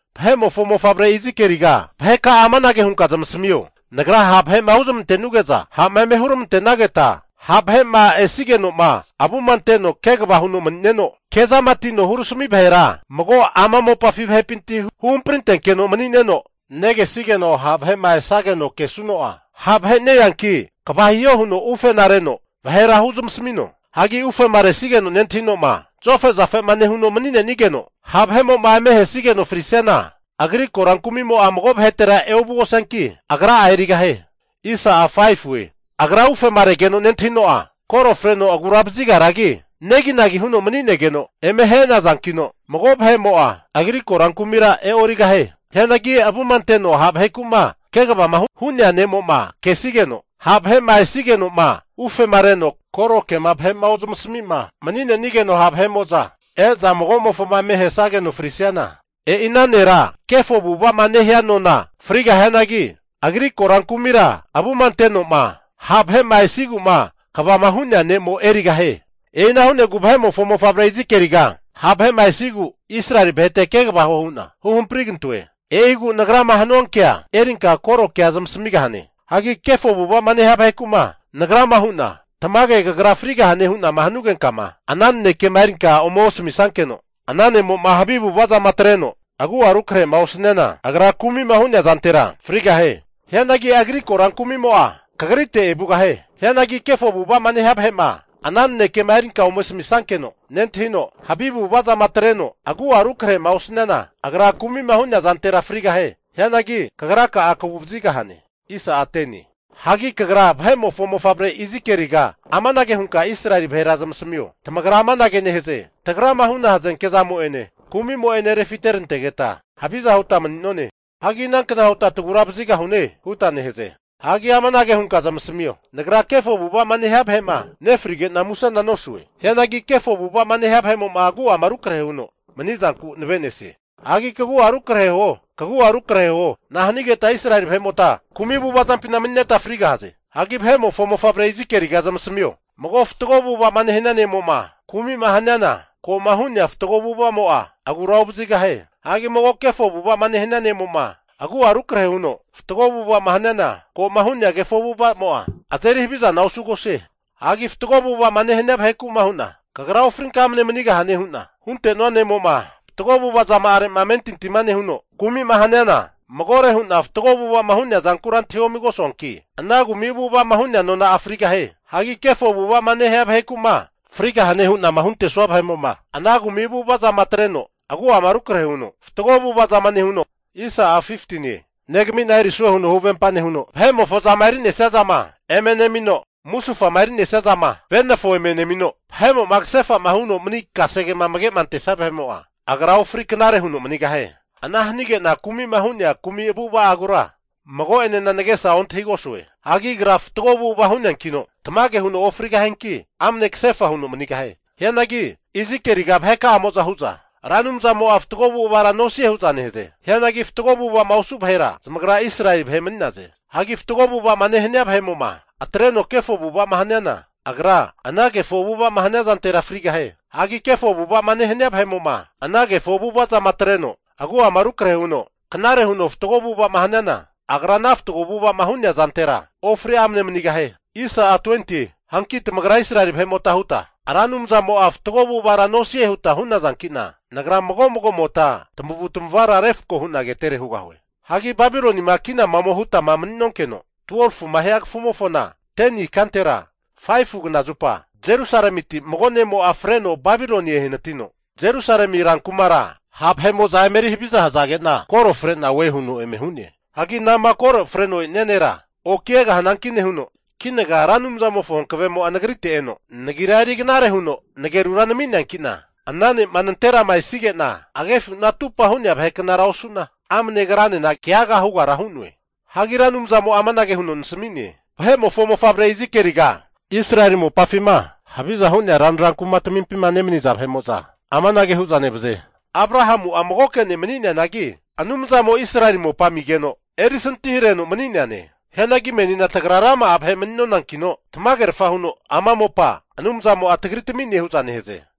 Vahe'mofo mofavre Izikieliga, vaheka'a amanage hunka zamasamio, Nagrama ha' vahe'ma huzmantenuge'za, ha'ma eme huramante'nageta ha' vahe'ma esigeno'ma avuma anteno kegava huno mani'neno, kezama atino huramasami vahera mago ama mopafi vahepinti hu hamprintenkeno mani'neno, negesigeno ha' vahe'ma esageno kesuno'a, ha' vahe neanki kva hiho huno ufe reno vahera huzmasamino. Hagi ufema resigeno'ma nentahino'ma zofe'zafema nehuno mani'nenigeno, ha' vahe'moma eme ahesageno frisiana agri korankumimo'a mago vahetera eovugosianki, agra'a erigahie. Agra ufema regeno nentahino'a koro freno agura vazigaragi, neginagi huno mani'negeno eme ahe'nazankino, mago vahe'mo'a agri korankumira e'origahie. Hianagi avuma anteno ha' vaheku'ma kegavama hu'nea ne'mo'ma kesigeno, ha' vahe'ma esigeno'ma ufema reno koro kema vahe'ma ozamasami'ma mani'nenigeno, ha' vahe'mo'za e'za mago'mofoma eme ahesageno frisiana, e'i ana nera kefo avu'ava'ma nehia nona'a frigahianagi, agri korankumira avuma ante'noma ha' vahe'ma esigu'ma kvama hu'nea ne'mo erigahie. E'ina hu'negu vahe'mofo mofavre Izikieliga, ha' vahe'ma esigu Israeli vahete kegava huo hu'na hu hamprigante'noe. E'igu Nagrama hanuankea erinka korokea zamasamigahane. Hagi kefo avu'ava'ma nehia vaheku'ma Nagrama hu'na, tamage kagra frigahane hu'nama hanugenkama, ana nanekema erinka ome osamisankeno ana ne'mo'ma havi avu'avazama atreno agu'a rukrahe'ma osaniana, agra kumi'ma hu'nea zantera frigahie. Hianagi agri korankumimo'a kagrite evugahie. Hianagi kefo avu'ava'ma nehia vahe'ma ana nanekema erinka ome asamisankeno nentahino, havi avu'avazama atreno agua rukrahema osaniana, agra kumima hu'nea zantera frigahie. Hianagi kagra'a kaguvazigahane. Hagi kagra vahe'mofo mofavre Izikieliga amanage hunka Israeli vahera zamasamio, tamagra amanage nehaze, tagrama huna hazenke zamo'ene kumi'mo'ene refiterantegeta haviza huta mani'none. Hagi inankna huta tagura vazigahune? huta nehaze. Hagi amanage hunka zamasamio, Nagra kefo avu'ava'ma nehia vahe'ma nefrige'na musena nosue. Hianagi kefo avu'ava'ma nehia vahe'mo'ma agu'ama rukrahe huno mani'zanku nave'nesie. Hagi kagu'a rukrahe huo, kagu'a rukrahe huo. Nahanigeta Israeli vahe'mota kumi avu'ava zampina mani'neta frigahaze? Hagi vahe'mofo mofavre Izikieliga zamasmio, mago fatgo avu'ava'ma nehania ne'mo'ma kumi'ma haniana, ko'ma hu'nea fatgo avu'ava'amo'a agura ovazigahie. Hagi mago kefo avu'ava'ma nehania ne'mo'ma, agu'a rukrahe huno fatgo avu'ava haniana, ko'ma hu'nea kefo avu'ava'amo'a azeri havizana osugosie. Hagi fatgo avu'ava'ma nehania vaheku'ma hu'na, kagra ofrinka amne manigahane hu'na hunte'nenua ne'mo'ma, fatgo avu'ava zama'are'ma amentintima nehuno, kumi'ma haniana magore hu'na fatgo avu'ava'ma hu'nea zankura antahiomigosuanki, ana kumi avu'ava'ma hu'nea nona'a frigahie. Hagi kefo avu'ava'ma nehia vaheku'ma frigahane hu'nama huntesua vahe'mo'ma, ana kumi avu'avazama atreno agua'ama rukrahe huno fatgo avu'avazama nehuno, negami'na erisue huno huvempa nehuno vahe'mofo zama eri'nesia zana eme nemino, musufama eri'nesia zana venafo ome nemino, vahe'mo'ma kasefa'ma huno mani kasege amage'ma antesia vahe'mo'a, agra ofri knare huno manigahie. Ana hanige'na kumi'ma hu'nea kumi avu'ava'agura mago'enena nagesa ontahigosue. Hagi agra fatgo avu'ava hu'neankino, tamage huno ofrigahianki amne kasefa huno manigahie. Hianagi Izikieliga vaheka'amo'za hu'za, Ra Anumzamo'a fatgo avu'avara nosie hu'za nehaze. Hianagi fatgo avu'ava'ma osu vahera zamagra Israeli vahe mani'naze. Hagi fatgo avu'ava'ma nehania vahe'mo'ma atreno kefo avu'ava'ma haniana, agra ana kefo avu'ava'ma hania zantera frigahie. Hagi kefo avu'ava'ma nehania vahe'mo'ma ana kefo avu'avazama atreno agu'ama rukrahe huno knare huno fatgo avu'ava'ma haniana, agra ana fatgo avu'ava'ma hu'nea zantera ofri amne manigahie. Hanki tamagra Israeli vahe'mota huta, Ra Anumzamo'a fatgo avu'avara nosie huta hu'nazanki'na, Nagra mago mago vahe'mota tamavu tamavara refko hu'na ketere hugahue. Hagi Babilonima kinama ome hutama mani'nonkeno, 12fuma hia kafumofona 10ni ikantera 5fu knazupa, Jerusalemiti mago ne'mo'a freno Babiloni ehanatino, Jerusalemi rankumara ha' vahe'mo'za eme eri haviza hazage'na koro frena oe huno eme hu'ne. Hagi anama koro freno esia nera oki egahianki nehuno, kinaga Ra Anumzamofo hankavemo'a nagrite eno, nagira eri knare huno nagerura nami'neankina ana ne'ma nanterama esige'na agefuna atupa hu'nea vahe knara osu'na, amne agranena keaga hugara hu'noe. Hagi Ra Anumzamo'a amanage huno nasami'ne, Vahe'mofo mofavre Izikieliga, Israeli mopafima haviza hu'nea ranra kumatmimpima nemani'za vahe'mo'za amanage hu'za nevaze, Abrahamu'a magoke ne' mani'neanagi Anumzamo Israeli mopa amigeno erisantihareno mani'neane. Hianagi menina tagra rama'a vahe mani'nonankino, tamagerfa huno ama mopa Anumzamo'a tagri tami'ne hu'za nehaze.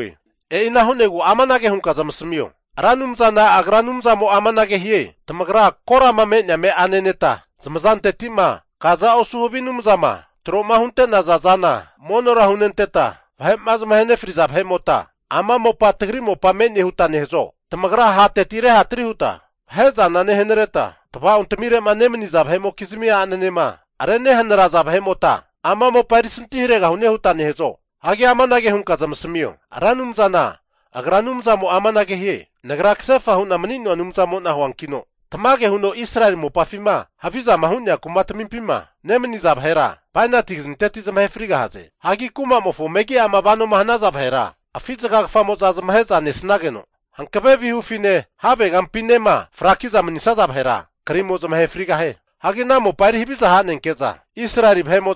E'ina hu'negu amanage hunka zamasamio, Ra Anumzana Agra Anumzamo'a amanage hie, Tamagra korama me'nea ame'a neneta, zamazanteti'ma kaza osu havi anumza'ma tro'ma hunte'naza zana monora hunenteta, vahe'ma zamahe nefriza vahe'mota, ama mopa tagri mopa me'ne huta nehazo? Tamagra hateti rehatri huta vahe'zana nehanareta, tava'ontamirema nemaniza vahe'mokizmi a'nanema renehanaraza vahe'mota ama mopa erisanti haregahune huta nehazo? Hagi amanage hunka zamasamio, Ra Anumzana Agra Anumzamo'a amanage hie, Nagra kasefa hu'na mani'noa Anumzamo'na huankino, tamage huno Israeli mopafima havizama hu'nea kumatmimpima nemaniza vahera bainati kazinteti zamahe frigahaze. Hagi kumamofo megi'ama vanoma hanaza vahera, afi zagagafamo'za zamahe'za nesanageno, hankave vihufine havegampinema frakiza manisaza vahera krimo zamahe frigahie. Hagi ana mopa eri haviza hanenke'za Israeli vahe'moma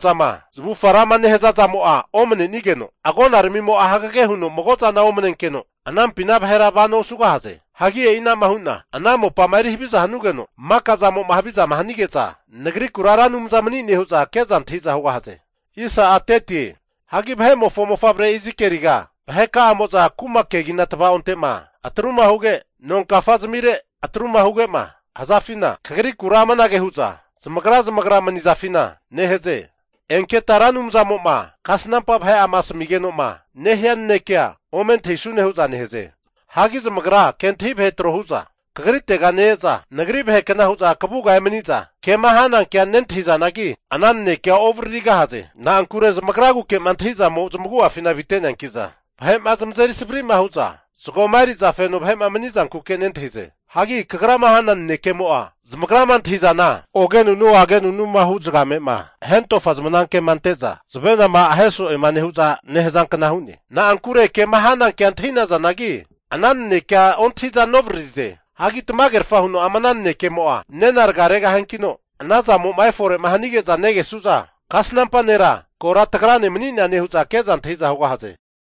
zamavufaga rama nehaza zamo'a omanenigeno, agonaramimo'a hagege huno magozana omnenkeno anampina vahera vanoa osugahie. Hagi e'ina'ma hu'na ana mopama eri haviza hanugeno maka zamo'ma havizama hanige'za Nagrikura Ra Anumza mani'ne hu'za ke'za antahi'za hugahaze. Hagi vahe'mofo mofavre Izikieliga, vaheka'amo'za kuma kegina tavaonte'ma atruma huge, nonkafa zamire atruma huge'ma hazafina kagrikura amanage hu'za zamagra zamagra mani'zafina nehaze, enketa Ra Anumzamo'ma kasampa vahe'ama asamigenoma nehia naneke ome antahisune hu'za nehaze. Hagi zamagra kentahi vahe tro hu'za kagritega ne-eza, Nagri vahekna hu'za kavuga emani'za kema hanankea nentahizanagi, ana nanekea ovaririgahaze. Na'ankure zamagraguke'ma antahizamo zamagu'afina avite'neankiza, vahe'ma zamazeri savri'ma hu'za zagoma eri'za feno vahe'ma mani'zankuke nentahize. Hagi kagrama hana nanekemo'a zamagrama antahi'zana, ogenunu agenunuma hu zagame'ma hentofa zamanke'ma ante'za zavenama ahe so'ema nehu'za nehazankna hu'ne. Na'ankure kema hanankea antahi'nazanagi, ana nanekea ontahi'za novaririze. Hagi tamagerfa huno ama ana nanekemo'a nena raga regahiankino, ana zamo'ma efore'ma hanige'za negesu'za, kasnampa nera kora tagrane mani'neane hu'za ke'za antahi'za hugahaze.